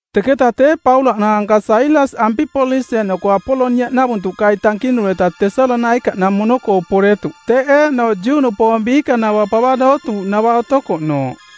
Teketa tee Paulaꞌ naanka Sailas Ampipolis eeꞌnoko Apoloniaꞌnavuntuꞌkai tankinureta Tesalonaikaꞌnamono-koo poretuꞌ teꞌ eeꞌnooꞌ Juꞌnupoong biikanava pava dootuuꞌnava otokoꞌnooꞌ.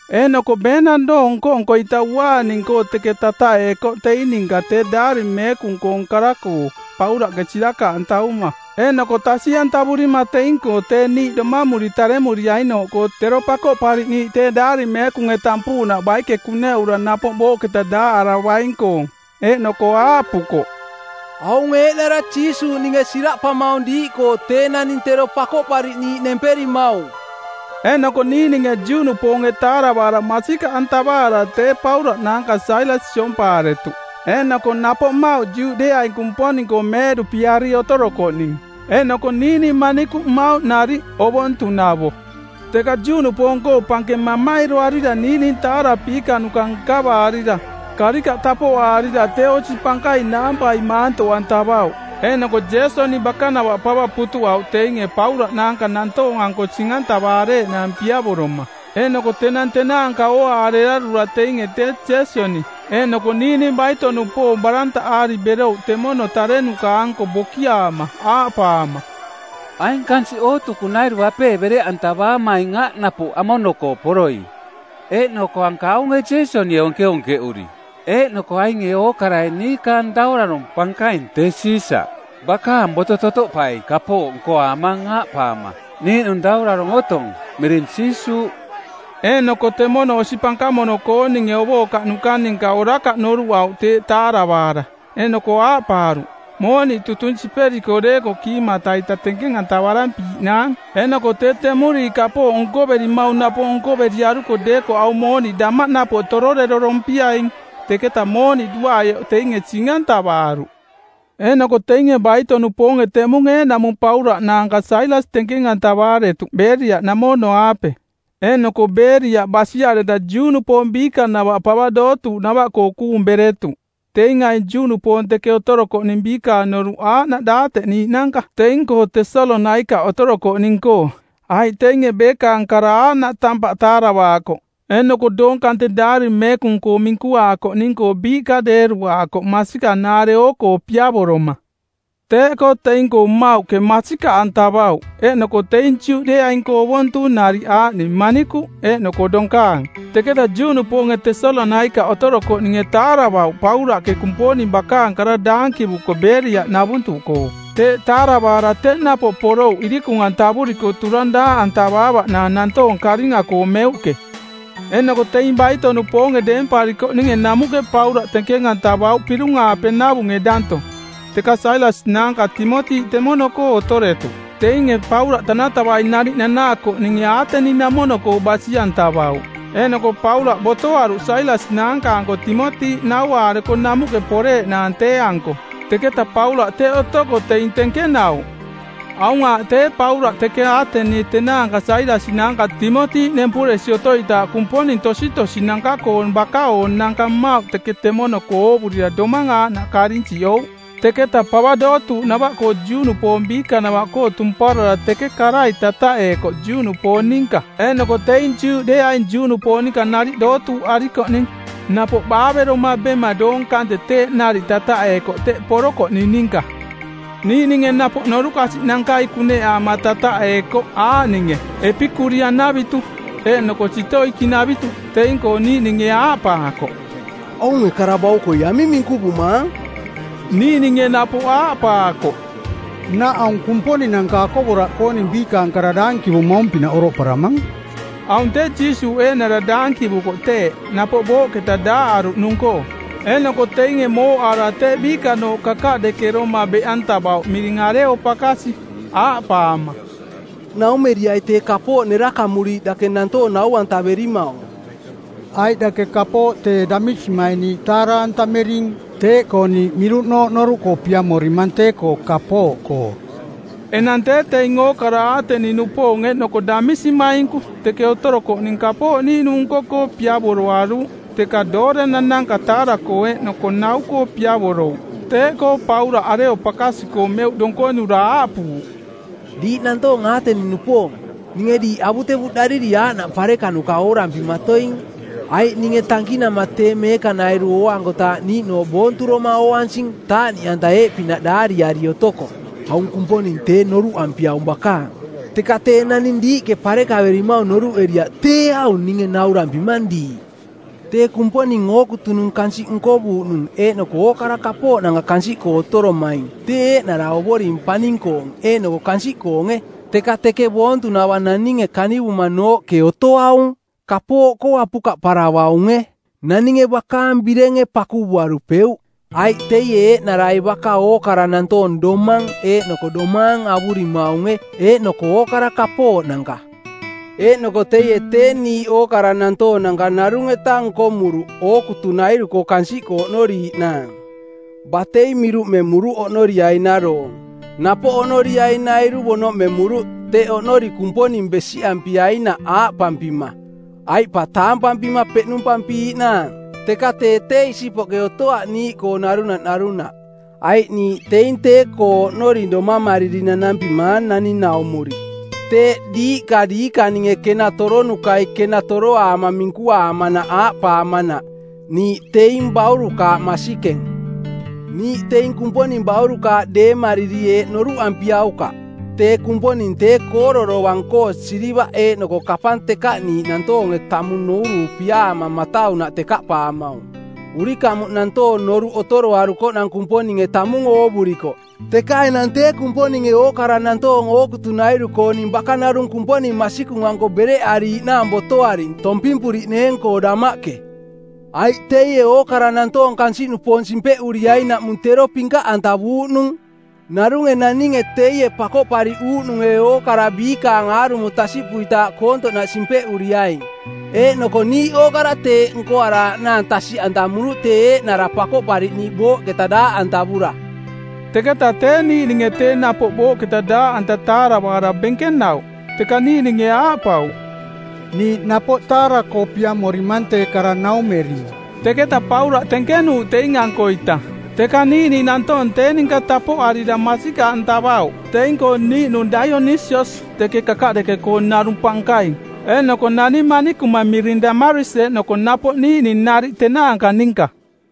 Eeꞌnoko beenang doong nko-nko-ita uaaning-koo teke tataꞌeekoꞌ teing ninka tee Daari Meekung-koong kara-koo, Paulaꞌke sirakaꞌantavuma eeꞌnoko tasiꞌantavurima teing-koo tee niiꞌ domamuri taremuriainooꞌkoo tero Pakoꞌpariꞌniiꞌ tee Daari Meekunge tampuuꞌnaꞌ baike kuneꞌura napoꞌ booꞌketa daaꞌaravaing-koong. Eeꞌnoko aaꞌpukoꞌ, “Aung eeꞌnara Jiisuuꞌ ninge siraꞌpamaung diiꞌkoo tee naning tero Pakoꞌpariꞌniiꞌ nemperimaung.” Eeꞌnoko niiꞌninge Juꞌnupoonge taaravaara masikaꞌantavaara tee Paulaꞌ naanka Sailas siompaaretuꞌ, eeꞌnoko napoꞌ mmauꞌ Juꞌdeeaing Kumponing-koo meeꞌduꞌpiari otorokoꞌning eeꞌnoko niiꞌning manikuꞌ mmauꞌ nariꞌ, ovontunavo. Teka Juꞌnupoong-koo pankeng mamairoarira niiꞌning taarapiikanuka nkavaarira, karikaꞌ tapoꞌaarira tee osi pankaing naampai maantoꞌantavauꞌ, eeꞌnoko Jeesoni bakanava pava putuꞌauꞌ teinge Paulaꞌ naanka nantoong-anko sing-antavareeꞌnaang piavoroma. Eeꞌnoko tenang tenaanka ooaarearura teinge tee Jeesoni eeꞌnoko niiꞌning baito-nupoong barantaꞌaari berouꞌ temono tarenuka-anko bokiaama aaꞌpaama, “Aing kansiꞌ ookutunairu apee bereꞌantavaamaing aꞌ napoꞌ amono-koo poroi. Eeꞌnoko anka aunge Jeesonie onkeonkeꞌuri. Eeꞌnoko ainge ookarai niikaang daurarong˜ pankaing, tee Siisaꞌ, bakaang boto totoꞌpai kapooꞌ nkoaamang aaꞌpaama, ‘Niiꞌnung daurarong otong, miring Jiisuuꞌ.’” Eeꞌnoko temono osi pankamono-kooninge ovookaꞌnuka ninka orakaꞌ noruꞌauꞌ teeꞌ taaravaara. Eeꞌnoko aaꞌpaaruꞌ, “Mooniꞌ tutung siperiko deekoꞌ kiimata-ita tenkeng-antararampiiꞌnaang eeꞌnoko tee temuriiꞌ kapooꞌ nkoverimaung napoꞌ nkoveriaruko deekoꞌ aung mooniꞌ damaꞌ napoꞌ tororerorompiaing.” Teketa mooniꞌ duaꞌaioꞌ teinge sing-antavaaruꞌ. Eeꞌnoko teinge baito-nupoonge teꞌmung eeꞌnaꞌmung Paulaꞌ naanka Sailas tenkeng-antavaaretuꞌ Beeriaꞌnamono-aape, eeꞌnoko Beeriaꞌ basiareta Juꞌnupoong biikanava pava dootuuꞌnava-koo kuung beretuꞌ. Teing aing Juꞌnupoong teke otorokoꞌning biikaang noruꞌ aaꞌnaꞌ daateꞌniiꞌnanka teing-koo Tesalonaikaꞌke otorokoꞌning-koo, aiꞌ teinge beekaang kara aaꞌnaꞌ tampaꞌ taaravaakoꞌ eeꞌnoko doong kante Daari Meekung-koo minkuaakoꞌning-koo biiꞌka deeruaakoꞌ masikanaare oo-koo piavoroma. Teeꞌkoo teing-koo mmauꞌke masikaꞌantavauꞌ, eeꞌnoko teing Juꞌdeeaing-koo ovontung nariꞌ aaꞌning manikuꞌ eeꞌnoko donkaang. Teketa Juꞌnupoonge Tesalonaikaꞌ otorokoꞌninge taaravauꞌ Paulaꞌke Kumponing bakaang kara daankivuko Beeriaꞌnavuntuꞌkoo, teeꞌ taaravaara teꞌ napoꞌ porouꞌ irikung-antavuriko turang daaꞌantavaavaꞌnaang nantoong karinga-koo meuꞌke. Eeꞌnoko teing baito-nupoonge deemparikoꞌninge namuꞌke Paulaꞌ tenkeng-antavauꞌ pirung-aape navunge danto, teka Sailas naanka Timoti teke temono-koo otoretuꞌ. Teinge Paulaꞌ tanatavai nariꞌ nanaakoꞌninge Aateni-namono-koo basi-antavauꞌ, eeꞌnoko Paulaꞌ botoaruꞌ Sailas naanka-anko Timoti, nauaareko namuꞌke poreeꞌnaang tee-anko. Teketa Paulaꞌ teꞌ otoko teing tenkenauꞌ. Aung aaꞌ tee Paulaꞌ teke Aatenie tenaanka Sailas naanka Timoti nempuresi otoitaaꞌ kumponing tositosinanka-koong baka-oonanka mmauꞌ teka temono-koo oovurira domang aaꞌnaꞌ karinsiꞌouꞌ. Teketa pava dootuuꞌnava-koo Juꞌnupoong biikanava-koo tumparara teke karai tataꞌeekoꞌ Juꞌnupoong ninka eeꞌnoko teing Juꞌdeeaing Juꞌnupoong ninka nariꞌ dootuuꞌarikoꞌning, napoꞌ baaveroma bema doong kante teeꞌ nariꞌ tataꞌeekoꞌ teꞌ porokoꞌning ninka. Niiꞌninge napoꞌ norukasiꞌnankai kuneꞌaama tataꞌeekoꞌ aaꞌninge Epikurian-navitu eeꞌnoko Sitoikiꞌnavitu. Teing-koo niiꞌninge aaꞌpaakoꞌ, “Aunge kara baukoi aming minkuvumaang?” Niiꞌninge napoꞌ aaꞌpaakoꞌ, “Nnaꞌ aung kumponinanka akovoraꞌkooning biikaang kara daankivumaung-pinaꞌ oroꞌparamang.” Aung tee Jiisuuꞌ eeꞌnara daankivuko teeꞌ, napoꞌ booꞌketa daaꞌaruꞌnung-koo. Eeꞌnoko teinge mooꞌaara tee biikanooꞌ kakaꞌdekeroma beꞌantavauꞌ miring Areopakasi, aaꞌpaama, “Naumeriai tee kapooꞌ nerakamuriiꞌ dake nantoong nau-antaverimaung. Aiꞌ dake kapooꞌ tee damisimaing niiꞌ taara-antamering, teeꞌkoo niiꞌ miruꞌnooꞌ noruꞌkoo piamorimang tee-koo kapooꞌkoo.” Enang tee teing ookara Aateni-nupoong eeꞌnoko damisimainku teke otorokoꞌning kapooꞌ niiꞌnung nko-koo piavoroaruuꞌ teka doorenananka taara-koo eeꞌnoko nau-koo piavorouꞌ. Teeꞌkoo Paulaꞌ Areopakasi-koo meuꞌ donkonura aaꞌpuuꞌ, “Diiꞌ nantoong Aateni-nupoong, ninge diiꞌ avutevuꞌdariri aaꞌnaꞌ pareka nkonuka oorampimatoing. Aiꞌ ninge tankinama tee meekanairu ooankotaaꞌ niiꞌnooꞌ boonturoma ooansing taaꞌniꞌanta eeꞌpinaꞌ daariari otoko, ‘Aung Kumponing tee noruꞌampiaung bakaang.’ Teka tee naning diiꞌke parekaverimaung noruꞌeriaꞌ tee aung ninge naurampimang diiꞌ. Tee Kumponing ookutunung kansiꞌ nkovuuꞌnung eeꞌnoko ookara kapooꞌnanka kansiꞌkoo otoromaing tee eeꞌnara Ovoring paning-koong eeꞌnoko kansiꞌkoonge, teka teke boontunava naninge kanivumanooꞌke otoaung. Kapooꞌkoo apukaꞌparavaunge. Naninge bakaang birenge pakuvuarupeuꞌ, aiꞌ teie eeꞌnarai baka ookara nantoong domang eeꞌnoko domaang avurimaunge eeꞌnoko ookara kapooꞌnanka. Eeꞌnoko teie tee niiꞌ ookara nantoonanka narung-eta nkomuruꞌ ookutunairu-koo kansiꞌkoo oꞌnoriiꞌnaang. Batei miruꞌmemuruꞌ oꞌnoriainaroong, napoꞌ oꞌnoriainairu bonoꞌmemuruꞌ teꞌ oꞌnori Kumponing besiꞌampiainaꞌ aaꞌpampima, ‘Aiꞌ pa taampampima peꞌnumpampiiꞌnaang.’ Teka tee tee isipoꞌke otoaꞌ niiꞌkoo narunaꞌ narunaꞌ, aiꞌ niiꞌ teing tee-koo oꞌnori domamariri nanampimaang naning-naummuri. Teeꞌ diiꞌka diikaninge kena toronukai kena toroaama minkuaamanaꞌ aaꞌpaamanaꞌ, ‘Niiꞌ teing baurukaaꞌ masikeng.’ “Niiꞌ teing Kumponing baurukaaꞌ deemariri eeꞌ noruꞌampiaukaꞌ: Tee Kumponing tee Kooro dovang-koo silivaꞌ eeꞌnoko kapang tekaꞌniiꞌ nantoonge tamung nuuruupiaama mataunaꞌ tekaꞌpaamaung. Urikamuꞌ nantoong noruꞌ otoroarukoꞌnang Kumponinge tamung oovurikoꞌ, teka enang tee Kumponinge ookara nantoong ookutunairu-kooning baka narung Kumponing masikung-anko bereꞌariiꞌnaang botoaring tompimpuriꞌneeng-koo damaꞌke. Aiꞌ teie ookara nantoong kansiꞌnupoong simpeꞌuriainaꞌmung tero pinkaꞌantavuuꞌnung. Narunge naninge teie Pakoꞌpariꞌuuꞌnunge˜ ookara biikaang aarumo tasiꞌpuitaaꞌ koontoꞌnaꞌ simpeꞌuriaing, eeꞌnoko niiꞌ ookara teeꞌ nkoaraaꞌnaang tasiꞌantamuruꞌ tee eeꞌnara Pakoꞌpariꞌniiꞌ booꞌketa daaꞌantavura.” Teketa tee niiꞌninge tee napoꞌ booꞌketa daaꞌanta taaravaara benkenauꞌ, teka niiꞌninge aaꞌpauꞌ, “Niiꞌ napoꞌ taara-koo piamorimang tee kara naumering.” Teketa Paulaꞌ tenkenuuꞌ teing-ankoita. Teka niiꞌning nantoong tee ninka tapoꞌarira masikaꞌantavauꞌ. Teing-koo niiꞌnung Daionisias teke kakaꞌdeke-koo narung pankaing eeꞌnoko nani manikuma miring Damaris eeꞌnoko napoꞌ niiꞌning nariꞌ tenaanka ninka.